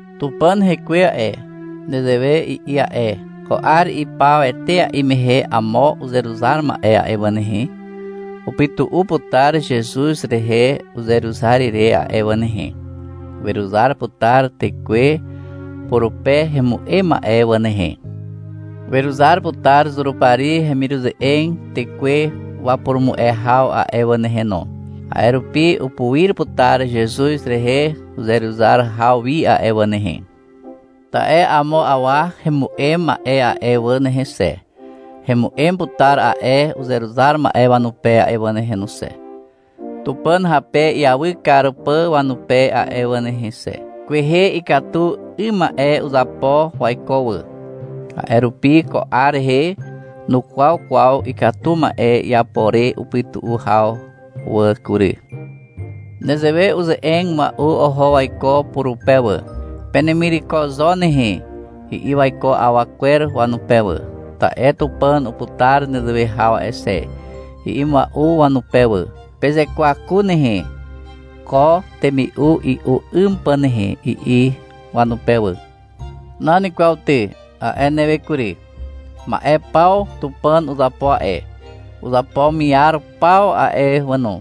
Tupàn Hekwe a'e, nezewe i'i a'e. — Ko 'ar ipaw etea'i mehe amo uzeruzar ma'e a'e wà nehe, upytu'u putar Zezuz rehe uzeruzar ire a'e wà nehe. Weruzar putar tekwe purupe hemu'em ma'e wà nehe. Weruzar putar Zurupari hemiruze'eg tekwe wapurumu'e haw a'e wà nehe no. A'e rupi upuir putar Zezuz rehe uzeruzar haw wi a'e wà nehe. Ta'e amo awa hemu'em ma'e a'e wà nehe xe, hemu'em putar a'e uzeruzar ma'e wanupe a'e wà nehe xe, Tupàn hape iawy kar pà wanupe a'e wà nehe xe. Kwehe ikatu 'ym ma'e uzapo waiko wà. A'e rupi ko 'ar rehe nukwaw kwaw ikatu 'ym ma'e iapo re upytu'u haw wà kury. Nezewe uze'eg mua'u oho waiko purupe wà, — Penemireko zo nehe, i'i waiko awa kwer wanupe wà. — Ta'e Tupàn uputar nezewe haw a'e xe, i'i mua'u wanupe wà. Pezekwaku nehe, ko temi'u i'u 'ym pà nehe, i'i wanupe wà. — Nan kwaw ty, a'e newe kury. Ma'e paw Tupàn uzapo a'e, uzapo miar paw a'e wà no.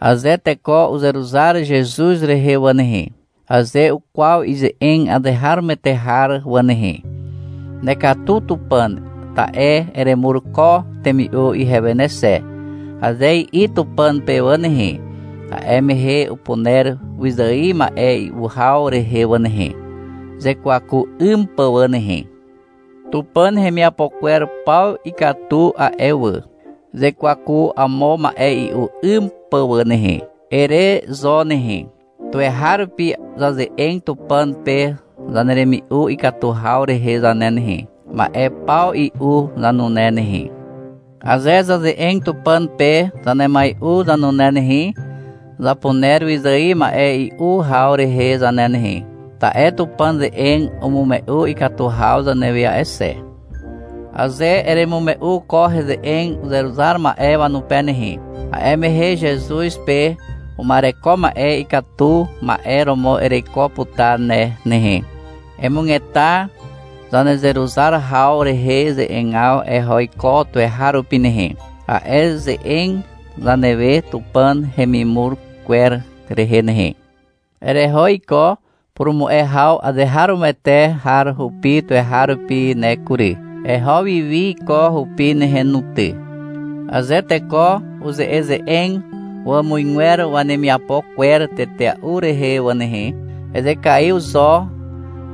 Aze teko uzeruzar Zezuz rehe wà nehe, aze ukwaw ize'eg azeharomoete har wà nehe, — Nekatu Tupàn, ta'e eremur ko temi'u ihewe ne xe, aze i'i Tupàn pe wà nehe, a'e mehe upuner wyzài ma'e i'u haw rehe wà nehe, uzekwaku 'ym pà wà nehe. Tupàn hemiapo kwer paw ikatu a'e wà. — Zazekwaku amo ma'e i'u 'ym pà nehe, ere zo nehe. Tuweharupi zaze'eg Tupàn pe zaneremi'u ikatu haw rehe zane nehe, ma'e paw i'u zanune nehe. Aze zaze'eg Tupàn pe zanemai'u zanune nehe, zapuner wyzài ma'e i'u haw rehe zane nehe, ta'e Tupàn ze'eg umume'u ikatu haw zanewe a'e xe. Aze eremume'u ko ze'eg uzeruzar ma'e wanupe nehe, a'e mehe Zezuz pe uma'ereko ma'e ikatu ma'e romo ereiko putar ne nehe. Emugeta zanezeruzar haw rehe ze'egaw eho iko tuweharupi nehe, a'e ze'eg zanewe Tupàn hemimur kwer rehe nehe. Ereho iko purumu'e haw azeharomoete har rupi tuweharupi ne kury. Eho wiwi iko hupi nehe no ty. Aze teko uze'eze'eg wàmuzgwer wanemiapo kwer tetea'u rehe wà nehe, ezekaiw zo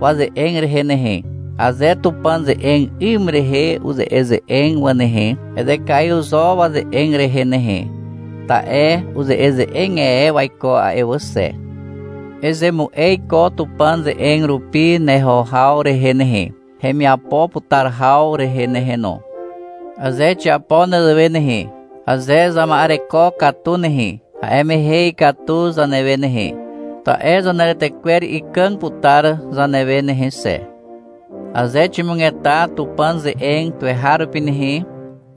waze'eg rehe nehe. Aze Tupàn ze'eg 'ym rehe uze'eze'eg wà nehe, ezekaiw zo waze'eg rehe nehe, ta'e uze'eze'eg e waiko a'e wà xe. Ezemu'e iko Tupàn ze'eg rupi neho haw rehe nehe, hemiapo putar haw rehe nehe no. Aze xiapo nezewe nehe, aze zama'ereko katu nehe, a'e mehe ikatu zanewe nehe, ta'e zaneretekwer ikàg putar zanewe nehe xe. Aze ximugeta Tupàn ze'eg tuweharupi nehe,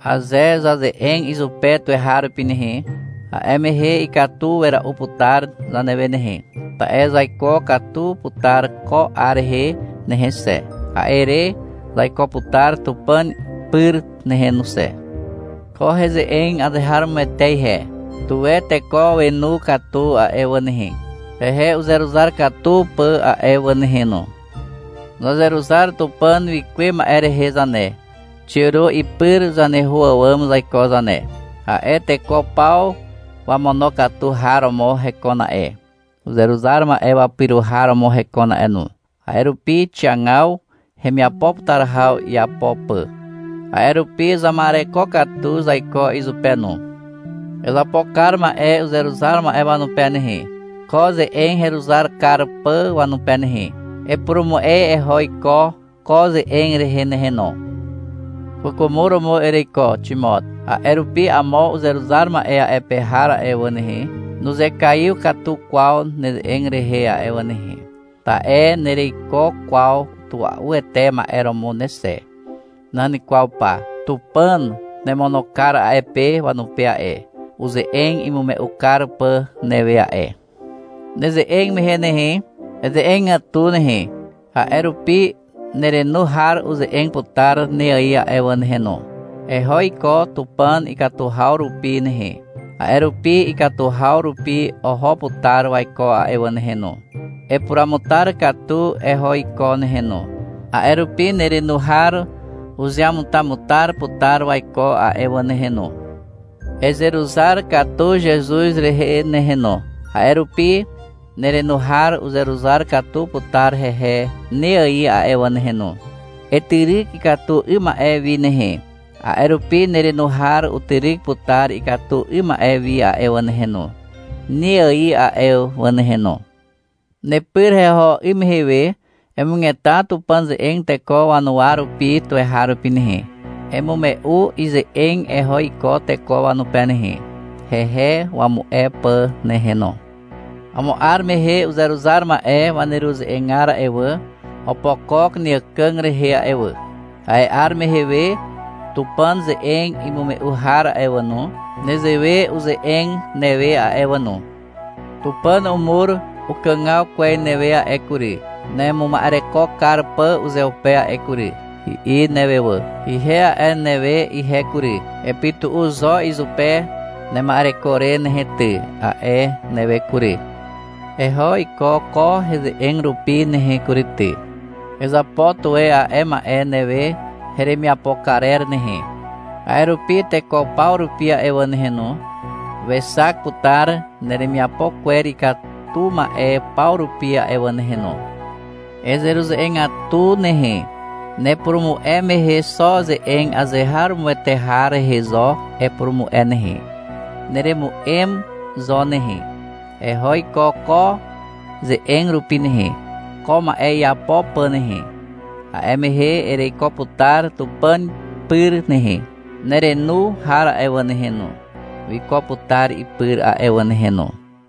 aze zaze'eg izupe tuweharupi nehe, a'e mehe ikatu wera'u putar zanewe nehe, ta'e zaiko katu putar ko 'ar rehe nehe xe, a'e re zaiko putar Tupàn pyr nehe no xe. Ko heze'eg azeharomoete ihe. Tuwe teko wenu katu a'e wà nehe, hehe uzeruzar katu pà a'e wà nehe no. Zazeruzar Tupàn wikuwe ma'e rehe zane, xiàro ipyr zaneho àwàm zaiko zane. A'e teko paw wamonokatu har romo hekon a'e, uzeruzar ma'e wapyro har romo hekon a'e no. A'e rupi xiagaw hemiapo putar haw iapo pà. A'e rupi zama'ereko katu zaiko izupe no. Ezapo kar ma'e uzeruzar ma'e wanupe nehe, ko ze'eg heruzar kar pà wanupe nehe. Epurumu'e eho iko ko ze'eg rehe nehe no. Kwàkwàmo romo ereiko, Ximot. A'e rupi amo uzeruzar ma'e a'e pe har a'e wà nehe, nuzekaiw katu kwaw neze'eg rehe a'e wà nehe. Ta'e nereiko kwaw tua'uete ma'e romo ne xe. Nan kwaw pa. Tupàn nemono kar a'e pe wanupe a'e, uze'eg imume'u kar pà newe a'e. Neze'eg mehe nehe, eze'egatu nehe, a'e rupi nerenu har uze'eg putar ne ài a'e wà nehe no. Eho iko Tupàn ikatu haw rupi nehe, a'e rupi ikatu haw rupi oho putar waiko a'e wà nehe no. Epuruamutar katu eho iko nehe no, a'e rupi nerenu har uzeamutamutar putar waiko a'e wà nehe no. Ezeruzar katu Zezuz rehe nehe no, a'e rupi nerenu har uzeruzar katu putar hehe ne ài a'e wà nehe no. Etyryk ikatu 'ym ma'e wi nehe, a'e rupi nerenu har utyryk putar ikatu 'ym ma'e wi a'e wà nehe no, ne ài a'e wà nehe no. Nepyr heho 'ym mehe we emugeta Tupàn ze'eg teko wanuwa rupi tuweharupi nehe. Emume'u ize'eg eho iko teko wanupe nehe, hehe wamu'e pà nehe no. Amo 'ar mehe uzeruzar ma'e waneruze'egar a'e wà, opokok neàkàg rehe a'e wà. A'e 'ar mehe we Tupàn ze'eg imume'u har a'e wà no, nezewe uze'eg newe a'e wà no. — Tupàn umur ukàgaw kwez newe a'e kury, nemuma'ereko kar pà uzeupe a'e kury, i'i newe wà. Ihe a'e newe ihe kury. — Epytu'u zo izupe nema'ereko re nehe ty, a'e newe kury. Eho iko ko heze'eg rupi nehe kury ty. Ezapo tuwe a'e ma'e newe heremiapo karer nehe. A'e rupi teko paw rupi a'e wà nehe no, wexak putar neremiapo kwer ikatu ma'e paw rupi a'e wà nehe no. Ezeruze'egatu nehe. Nepurumu'e mehe xo ze'eg azeharomoete har rehe zo epurumu'e nehe. Neremu'em zo nehe. Eho iko ko ze'eg rupi nehe, ko ma'e iapo pà nehe. A'e mehe ereiko putar Tupàn pyr nehe. Nerenu har a'e wà nehe no, wiko putar ipyr a'e wà nehe no.